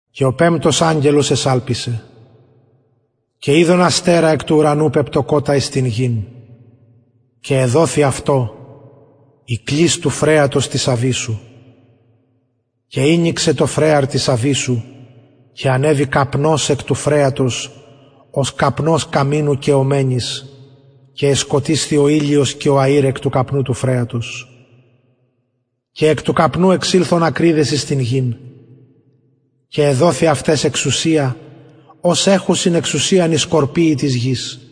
και ο πεμπτος αγγελος εσαλπισεν και ειδον αστερα εκ του ουρανου πεπτωκοτα εις την γην και εδοθη αυτω η κλεις του φρεατος της αβυσσου και ηνοιξεν το φρεαρ της αβυσσου και ανεβη καπνος εκ του φρεατος ως καπνος καμινου καιομενης και εσκοτισθη ο ηλιος και ο αηρ εκ του καπνου του φρεατος και εκ του καπνου εξηλθον ακριδες εις την γην και εδοθη αυταις εξουσια ως εχουσιν εξουσιαν οι σκορπιοι της γης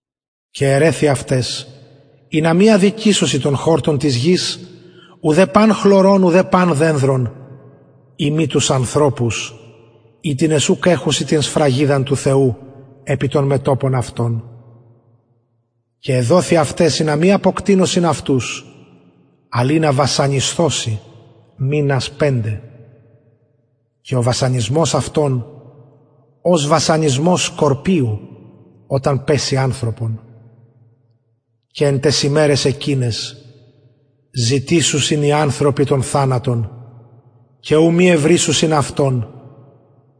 και ερρεθη αυταις ινα μη αδικησωσιν τον χορτον της γης ουδε παν χλωρον ουδε παν δενδρον ει μη τους ανθρωπους οιτινες ουκ εχουσιν την σφραγιδα του θεου επι των μετωπων αυτων και εδοθη αυταις ινα μη αποκτεινωσιν αυτους αλλ ινα βασανισθωσιν μηνας πεντε και ο βασανισμος αυτων ως βασανισμος σκορπιου οταν παιση ανθρωπον και εν ταις ημεραις εκειναις ζητησουσιν οι ανθρωποι τον θανατον και ου μη ευρησουσιν αυτον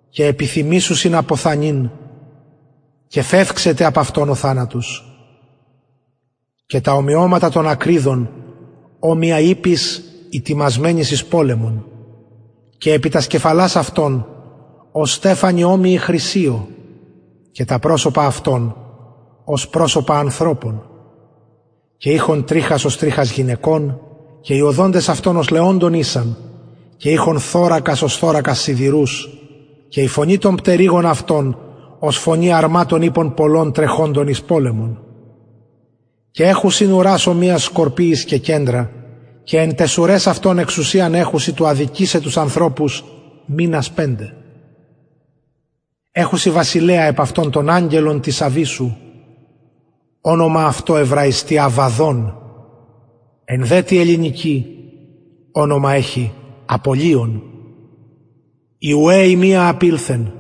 και επιθυμησουσιν αποθανειν και φευξεται απ αυτων ο θανατος και τα ομοιωματα των ακριδων ομοια ιπποις ητοιμασμενοις εις πολεμον και επι τας κεφαλας αυτων ως στεφανοι χρυσοι και τα προσωπα αυτων ως προσωπα ανθρωπων και ειχον τριχας ως τριχας γυναικων και οι οδοντες αυτων ως λεοντων ησαν και ειχον θωρακας ως θωρακας σιδηρους και η φωνη των πτερυγων αυτων ως φωνη αρματων ιππων πολλων τρεχοντων εις πολεμον και εχουσιν ουρας ομοιας σκορπιοις και κεντρα και εν ταις ουραις αυτων εξουσιαν εχουσιν του αδικησαι τους ανθρωπους μηνας πεντε εχουσαι βασιλεα επ αυτων αγγελον της αβυσσου ονομα αυτω εβραιστι αββαδων εν δε τη ελληνικη ονομα εχει απολλυων η ουαι η μια απηλθεν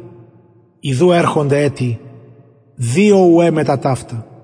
ιδου ερχεται ετι δυο ουαι μετα ταυτα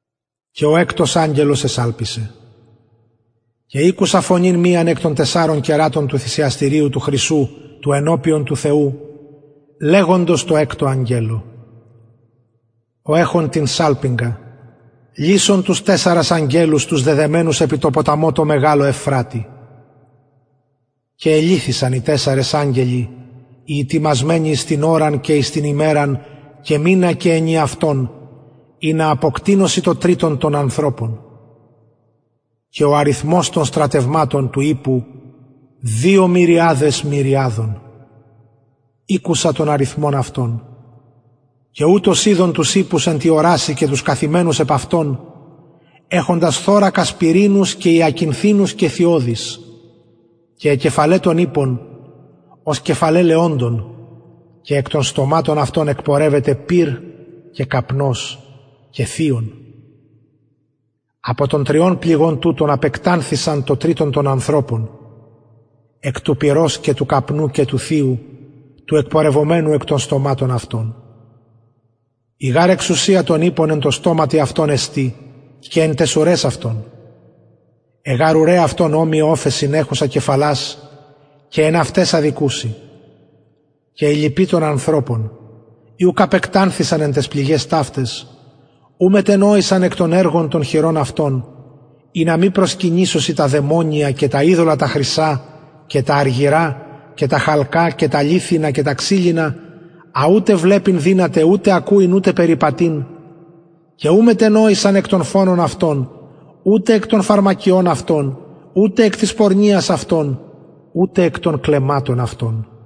και ο εκτος αγγελος εσαλπισεν και ηκουσα φωνην μιαν εκ των τεσσαρων κερατων του θυσιαστηριου του χρυσου του ενωπιον του θεου λεγουσαν τω εκτω αγγελω ο εχων την σαλπιγγα λυσον τους τεσσαρας αγγελους τους δεδεμενους επι τω ποταμω τω μεγαλω ευφρατη και ελυθησαν οι τεσσαρες αγγελοι οι ητοιμασμενοι εις την ωραν και εις την ημεραν και μηνα και ενιαυτον ινα αποκτεινωσιν το τριτον των ανθρωπων και ο αριθμος των στρατευματων του ιππου μυριαδες μυριαδων ηκουσα τον αριθμον αυτων και ουτως ειδον τους ιππους εν τη ορασει και τους καθημενους επ αυτων εχοντας θωρακας πυρινους και υακινθινους και θειωδεις και αι κεφαλαι των ιππων ως κεφαλαι λεοντων και εκ των στοματων αυτων εκπορευεται πυρ και καπνος και θειον απο των τριων πληγων τουτων απεκτανθησαν το τριτον των ανθρωπων απο του πυρος και του καπνου και του θειου του εκπορευομενου εκ των στοματων αυτων η γαρ εξουσια των ιππων εν τω στοματι αυτων εστιν και εν ταις ουραις αυτων αι γαρ ουραι αυτων ομοιαι οφεων εχουσαι κεφαλας και εν αυταις αδικουσιν και οι λοιποι των ανθρωπων οι ουκ απεκτανθησαν εν ταις πληγαις ταυταις ου μετενοησαν εκ των εργων των χειρων αυτων ινα μη προσκυνησωσιν τα δαιμονια και τα ειδωλα τα χρυσα και τα αργυρα και τα χαλκα και τα λιθινα και τα ξυλινα α ουτε βλεπειν δυναται ουτε ακουειν ουτε περιπατειν και ου μετενοησαν εκ των φονων αυτων ουτε εκ των φαρμακειων αυτων ουτε εκ της πορνειας αυτων ουτε εκ των κλεμματων αυτων